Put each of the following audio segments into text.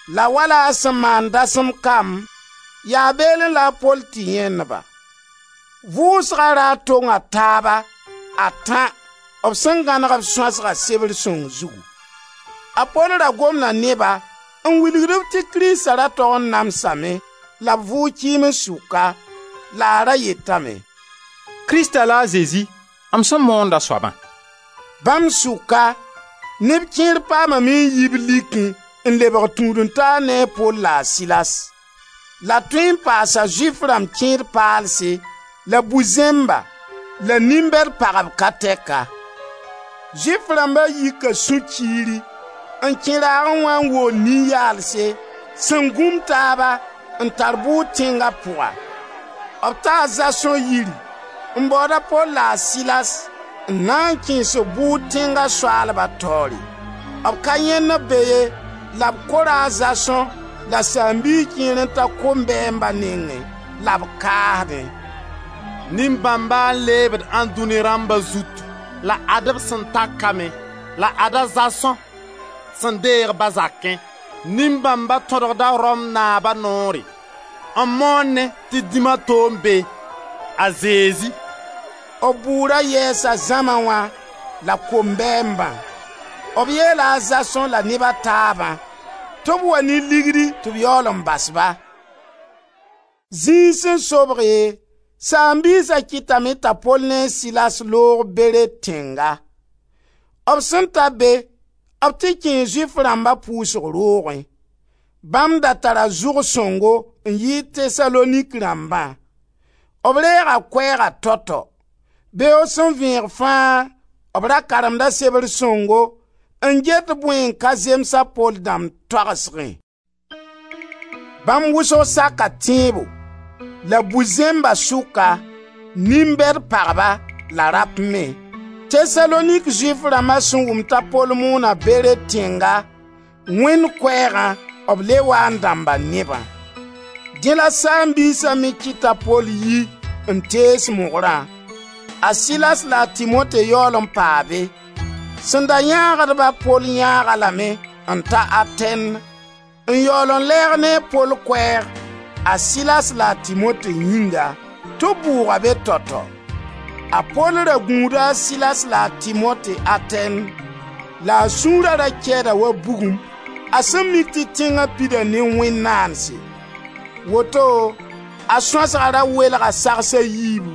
La wala a sẽn maand dasem kam, yaa beelẽ la a Pol tɩ yãend-ba. Vʋʋsga raar tong taaba a tã b sẽn gãneg b sõasgã sebr sõng zugu. A Pol ra gomda ne-ba n wilgd-b tɩ Krista ra tog n namsame la b vʋʋg kɩɩms sʋka, la a ra yetame: «Krista la a Zezi, m sẽn moond a soabã.» Bãmb sʋka neb kẽer paamame n yi b likẽ n lebg tũud-n-taar ne a Pol la a Silas. La tõe n paas a Zʋɩf rãmb kẽed-paalse la bu-zẽmba la nin-bɛd pagb ka tɛka. Zʋɩf rãmba yika sũ-kiiri, n kẽ raagẽ wã n wool nin-yaalse sẽn gũm taaba n tar bʋʋr tẽnga pʋga. B ta a Zason yiri n baood a Pol la a Silas n na kẽes-b bʋʋd tẽnga soaalba taoore. B ka yãend-b be ye la b kora a Zason la saam-biis kẽer n ta kombɛɛmba nengẽ la b kaasdẽ: «Nin-bãmba n leebd ãndũni rãmba zutu, la ad-b sẽn ta ka me. La ad-a Zason sẽn deeg-b a zakẽ. Nin-bãmba tõdgda Rom naaba noore, n moonẽ tɩ dĩm a to n be: a Zezi.» B bʋʋra yɛɛsa zãma wã la kombɛɛmbã. B yeela a Zason la neb a taabã tɩ b wa ne ligdi tɩ b yaool n bas-ba. Zĩig sẽn sobge, saam-biisa kɩtame t'a Pol ne a Silas loog Bere tẽnga. B sẽn ta be b tɩ kẽe Zʋɩf rãmba pʋʋsg roogẽ. Bãmb da tara zʋg sõngo n yɩɩd Tesalonik rãmbã. B reega Koɛɛga tao-tao. Beoog sẽn vẽeg fãa b ra karemda Sebr Sõngo n get bõe n ka zems a Pol dãmb toagsgẽ. Bãmb wʋsg saka tẽebo, la bu-zẽmba sʋka, nin-bɛd pagba, la rap me. Tesalonik Zʋɩf rãmba sẽn wʋm t'a Pol moona Bere tẽnga Wẽnd koɛɛgã b le waa n dãmba nebã. Dẽ la Saam-biisa me kɩt t'a Pol yi n tees mogrã. A Silas la a Timote yaool n paa be. Sẽn da yãagd-ba a Pol yãag-a lame n ta Atɛn n yaool n lɛɛg ne a Pol koɛɛg, a Silas la a Timote yĩnga: tɩ b bʋʋg-a be tao tao. A Pol ra gũuda a Silas la a Timote Atɛn la a sũura ra kɛɛda wa bugum, a sẽn mik tɩ tẽnga pida ne wẽn-naandse. Woto a sõasga ra welga sags a yiibu.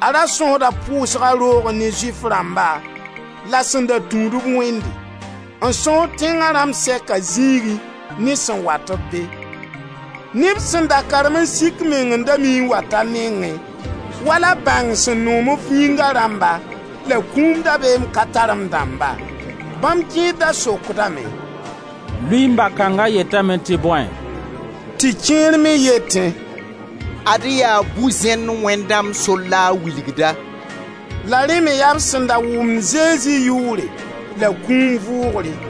A Ra sõsda pʋʋsga roogẽ ne Zʋɩf rãmba la sẽn da tũud-b Wẽnde; n sõsd tẽnga rãmb sɛka zĩigẽ ne sẽn wat-b be. Neb sẽn da karem n sik meng n da mii n wat a nengẽ, wala bãng sẽn noom f yĩnga rãmba, la kũum dabeem ka tar-m dãmba. Bãmb kẽer da sokdame: «Luiin-bag kãnga yetame tɩ bõe?» Tɩ kẽer me yetẽ: «Ad-y yaa bu-zẽnd wẽnd dãmb sor la a wilgda.» La rẽ me yaa b sẽn da wʋmd Zezi yʋʋre la kũum vʋʋgre.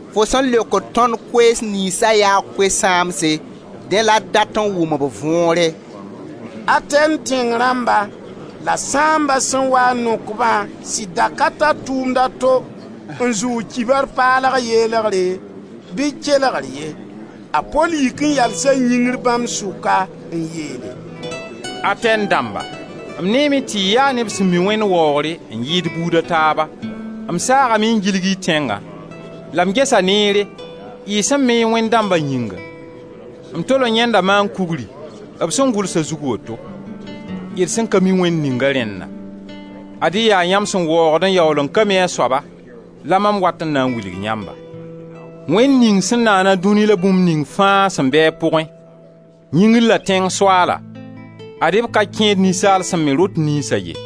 Fo sẽn leokd tõnd koees niynsa yaa koe-sãamse, dẽ la d dat n wʋm b võore.» Atɛn tẽng rãmba la sãamba sẽn waa n nok-bã sɩd da ka tar tʋʋmd a to n zʋʋg kibar paalg yelgre bɩ kelgr ye. A Pol yik n yalsa yĩngr bãmb sʋka n yeele: «Atɛn dãmba, m neeme tɩ y yaa neb sẽn mi wẽnd waoogre n yɩɩd buuda taaba. M saagame n gilg y tẽngã, la m gesa neere y sẽn me y wẽnd dãmba yĩnga. M tol n yãenda maan-kugri b sẽn gʋls a zug woto: ‹D sẽn ka mi wẽnd ninga rẽnna›. Ad-y yaa yãmb sẽn waoogd n yaool n ka mi a soaba la mam wat n na n wilg yãmba. Wẽnd ning sẽn naana dũnia la bũmb ning fãa sẽn be a pʋgẽ, yĩngr la tẽng Soaala, ad-y b ka kẽed ninsaal sẽn me rot niynsa ye.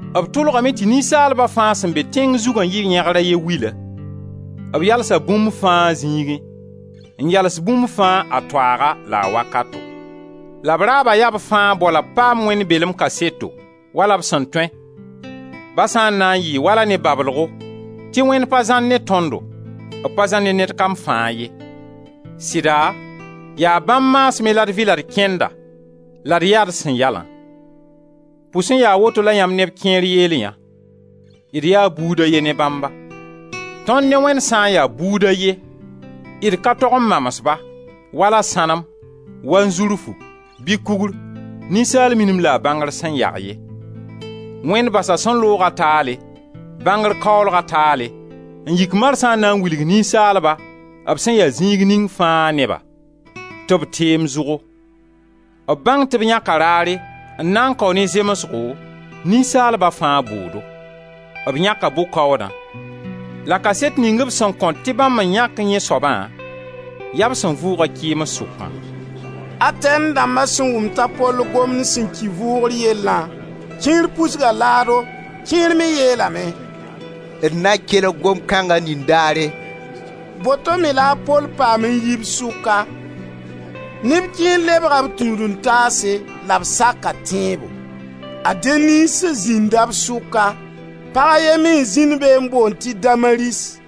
B tʋlgame tɩ ninsaalba fãa sẽn be tẽng zugã yɩ yẽgr a ye wila. B yalsa bũmb fãa a zĩigẽ, n yals bũmb fãa a toaaga la a wakato. La b raaba yaa b fãa bao la b paam Wẽnd belem kaseto, wala b sẽn tõe, ba sã n na yɩɩ wala ne bablgo, tɩ Wẽnd pa zãr ne tõndo, b pa zãr ne ned kam fãa ye. Sɩda yaa bãmb maasmẽ la d vɩ la d kẽnda la d yaa d sẽn yalã. Pʋs n yaa woto la yãmb neb kẽer yeel yã: ‹D yaa buud a ye ne Bãmba.› Tõnd ne Wẽnd sã n ya buud a ye, d ka tog n mams-ba wala sãnem, wanzurfu bɩ kugr, ninsaal minim la a bãngr sẽn yag ye. Wẽnd basa sẽn looga taale, bãngr kaoolga taale, n yik marsã n na n wilg ninsaalba, b sẽn ya zĩig ning fãa neba, tɩ b teem zʋgo. B bãng tɩ b yãka raare n na n kao ne zemsgo ninsaalba fãa bʋʋdo. B yãka bʋ-kaoodã, la kaset ning b sẽn kõt tɩ bãmb n yãk yẽ soabã, yaa b sẽn vʋʋg-a kɩɩms sʋkã.» Atɛn dãmba sẽn wʋm t'a Pol gomd sẽn ki vʋʋgr yellã, kẽer pusga laado. Kẽer me yeelame: «D na kelg gomd kãnga nindaare.» Boto me la a Pol paam n yi b sʋka. Neb kẽer lebga b tũud-n-taase la b saka tẽebo. A Denis zĩnda b sʋka. Pag a ye me n zĩnd be n boond tɩ Damaris.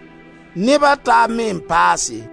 Neba taab me n paase.